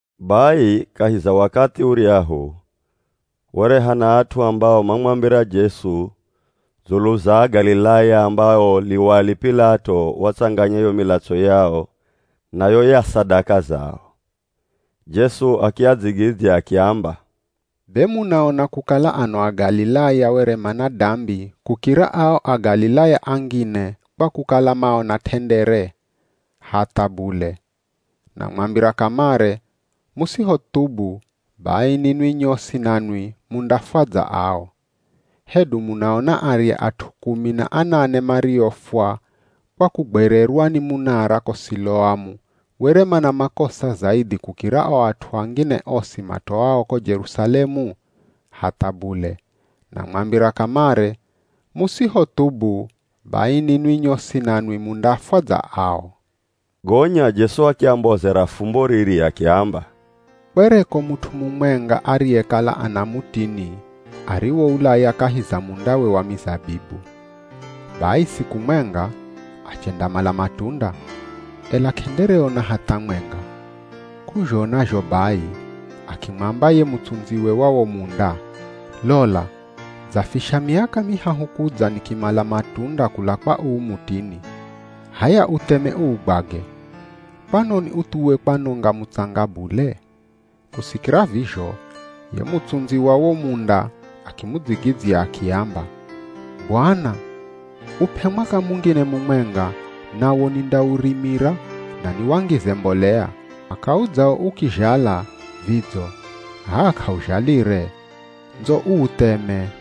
Bai kahi za wakathi uryahu were hana at'u ambao mamwambira Jesu dzulu za Agalilaya ambao Liwali P'ilato watsanganya yo milatso yao na yo ya sadaka zao. Jesu akiadzigidzya akiamba, “Be, munaona kukala ano Agalilaya were mana dambi kukira ao Agalilaya angine, kwa kukala maona t'endere? Hatha bule! Namwambira kamare, musihothubu, bai ninwi nyosi nanwi mundafwa dza ao. Hedu munaona arya at'u kumi na anane mariofwa kwa kugwererwa ni munara ko Siloamu were mana makosa zaidhi kukira o at'u angine osi matoao ko Jerusalemu? Hatha bule! Namwambira kamare, musihothubu, bai ninwi nyosi nanwi mundafwa dza ao.” Gonya Jesu akiambozera fumbo riri akiamba, “Kwereko mut'u mumwenga ariyekala ana mutini ariwoulaya kahi za mundawe wa mizabibu. Bai siku mwenga, achendamala matunda, ela k'endereona hatha mwenga. K'uzhona zho bai, akimwamba ye mutsundziwe wa wo munda, ‘Lola, dzafisha miaka mihahu kudza nikimala matunda kula kwa uu mutini. H'aya utheme uugwage! Kwanoni uthuwe kwanonga mutsanga bule?’ Kusikira vizho, ye mutsundzi wa wo munda akimudzigidzya akiamba, ‘Bwana, up'e mwaka mungine mumwenga, nawo nindaurimira na niwangize mbolea. Mwaka udzao ukizhala, vidzo, h'aa k'auzhalire ndzo uutheme.’”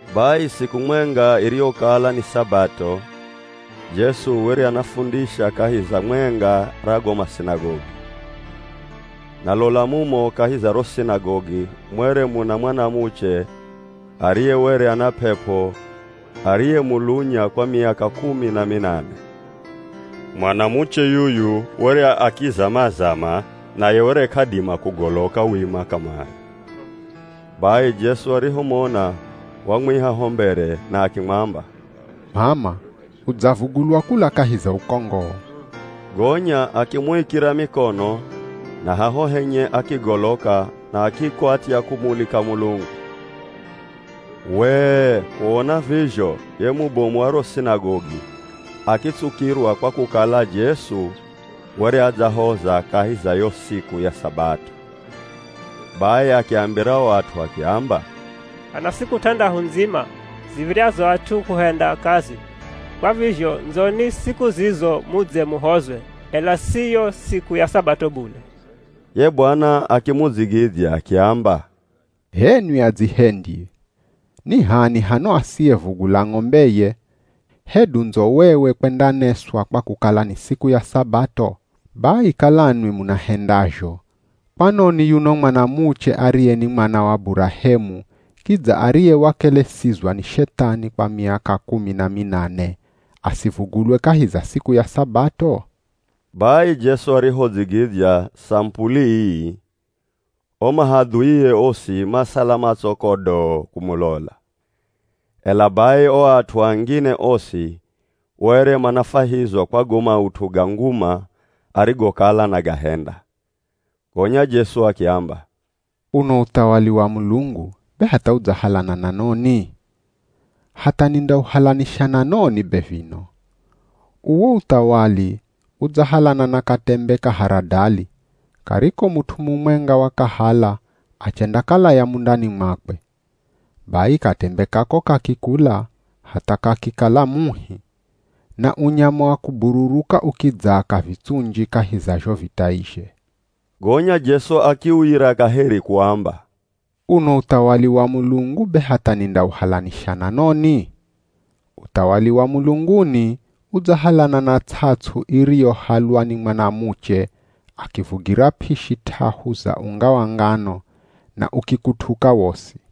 Bai siku mwenga iriyokala ni Sabato, Jesu were anafundisha kahi za mwenga ra go masinagogi. Na lola mumo kahi za ro sinagogi mwere muna mwanamuche ariye were ana p'ep'o ariyemulunya kwa miaka kumi na minane. Mwanamuche yuyu were akizama-zama naye were k'adima kugoloka wima kamare. Bai Jesu arihomona wamwiha ho mbere na akimwamba, “M'ama udzavugulwa kula kahi za ukongoo.” Gonya akimuikira mikono na haho henye akigoloka na akikwatya kumulika Mulungu. Wee, kuona vizho ye mubomu wa ro sinagogi akitsukirwa kwa kukala Jesu were adzahoza kahi za yo siku ya Sabato. Bai akiambira o at'u akiamba, “Hana siku t'andahu ndzima ziv̱iryazo at'u kuhenda kazi, kwa vizho ndzoni siku zizo mudze muhozwe, ela si yo siku ya Sabato bule.” Ye Bwana akimudzigidzya akiamba, “H'enwi adzihendyi! Ni h'ani hano asiyevugula ng'ombeye hedu ndzowewe kwendaneswa kwa kukala ni siku ya Sabato? Bai kala nwi munahendazho, kwanoni yuno mwanamuche ariye ni mwana wa Burahemu kidza ariye wakelesizwa ni Shethani kwa miaka kumi na minane asivugulwe kahi za siku ya Sabato?” Bai Jesu arihodzigidzya samupuli ii, o mahadhuie osi masala matso kodoo kumulola, ela bai o at'u angine osi were manafwahizwa kwa go maut'u ga nguma arigokala anagahenda. Gonya Jesu akiamba, “Uno uthawali wa Mulungu, be hatha udzahalana na noni? Hatha nindauhalanisha na noni be vino? Uwo uthawali udzahalana na katembe ka haradali, kariko mut'u mumwenga wakahala achendakalaya mundani mwakwe. Bai katembe kako kakikula hatha kakikala muhi, na unyama wa kubururuka ukidzaaka vitsunji kahi za zho vitaizhe.” Gonya Jesu akiuyira kaheri kuamba, “Uno uthawali wa Mulungu be hatha nindauhalanisha na noni? Uthawali wa mulunguni udzahalana na ts'ats'u iriyohalwa ni mwanamuche akivugira p'ishi t'ahu za unga wa ngano na ukikutuka wosi.”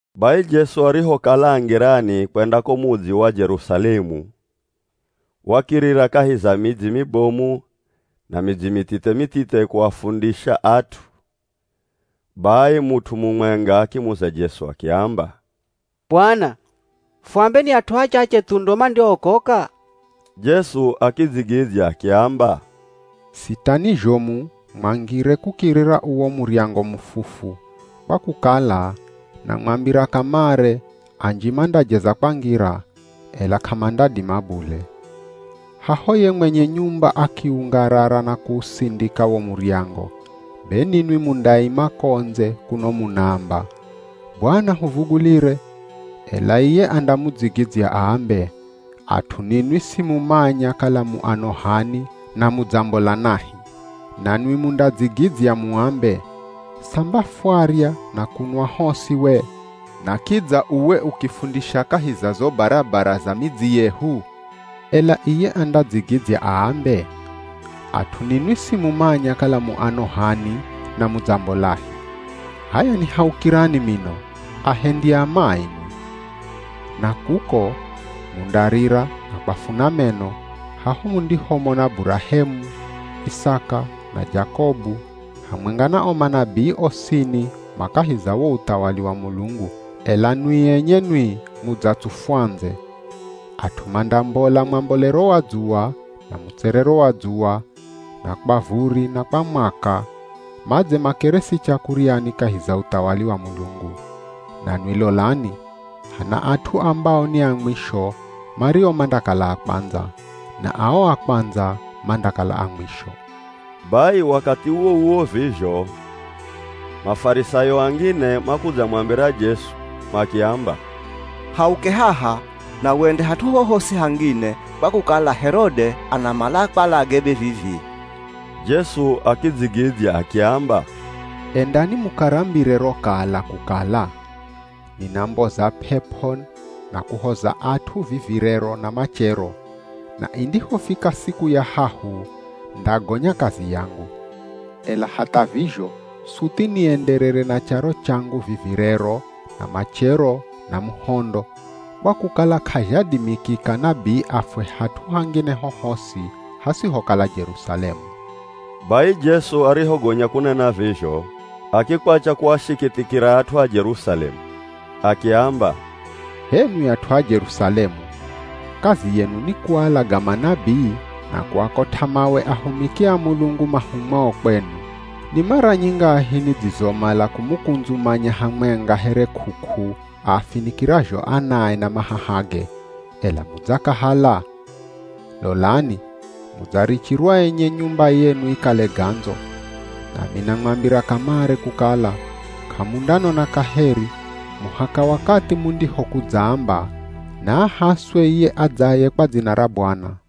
Bai Jesu arihokala a ngirani kwenda ko mudzi wa Jerusalemu, wakirira kahi za midzi mibomu na midzi mithithe-mithithe kuafundisha at'u. Bai mut'u mumwenga akimuza Jesu akiamba, “Bwana fuambe, ni at'u achache thu ndo mandiookoka?” Jesu akidzigidzya akiamba, “Sitani zhomu mwangire kukirira uwo muryango mufufu, kwa kukala, namwambira kamare anji mandajeza kwangira, ela k'amandadima bule. Haho ye mwenye nyumba akiungarara na kuusindika wo muryango, be ninwi mundaima ko ndze kuno munaamba, ‘Bwana, huvugulire!’ Ela iye andamudzigidzya aambe, ‘At'u ninwi simumanya kala mu ano h'ani na mudzambola nahi.’ Nanwi mundadzigidzya muambe, ‘Samba fwarya na kunwa hosi we? Na kidza uwe ukifundisha kahi za zo barabara za midzi yehu?’ “Ela iye andadzigidzya aambe, ‘At'u ninwi simumanya kala mu ano h'ani na mudzambolahi. H'aya nihaukirani mino, ahendi a mai nwi!’ “Na kuko mundarira na kwafuna meno, haho mundihomona, Burahemu, Isaka, na Jakobu hamwenga na o manabii osini ma kahi za wo uthawali wa Mulungu, ela nwi enye nwi mudzatsufwa ndze. At'u mandambola mwambolero wa dzuwa, na mutserero wa dzuwa, na kwa vuri na kwa mwaka, madze makeresi chakuryani kahi za uthawali wa Mulungu. Nanwi lolani, hana at'u ambao ni a mwisho, mario mandakala a kwandza, na ao a kwandza mandakala a mwisho.” Bai wakathi uwo-uwo vizho, Mafarisayo angine makudzamwambira Jesu, makiamba, “Hauke haha, na wende hat'u hohosi hangine, kwa kukala Herode anamala akwalage be vivi.” Jesu akidzigidzya akiamba, “Endani mukarambire ro kala kukala, ‘Ninamboza p'ep'o na kuhoza at'u vivi rero na machero, na indihofika siku ya hahu ndagonya kazi yangu.’ Ela hatha vizho suthi nienderere na charo changu vivi rero na machero na muhondo, kwa kukala k'azhadimikika nabii afwe hat'u hangine hohosi hasihokala Jerusalemu!” Bai Jesu arihogonya kunena vizho, akikwacha kuashikithikira at'u a Jerusalemu. Akiamba, “H'enwi at'u a Jerusalemu. Kazi yenu ni kualaga manabii na kuakot'a mawe ahumiki a Mulungu mahumwao kwenu. Ni mara nyingahi nidzizomala kumukundzumanya hamwenga here k'uk'u aafinikirazho anae na mahahage, ela mudzakahala? Lolani mudzarichirwa enye nyumba yenu ikale gandzo. Nami namwambira kamare kukala, k'amundanona kaheri muhaka wakathi mundihokudzaamba, ‘Naahaswe iye adzaye kwa dzina ra Bwana.’”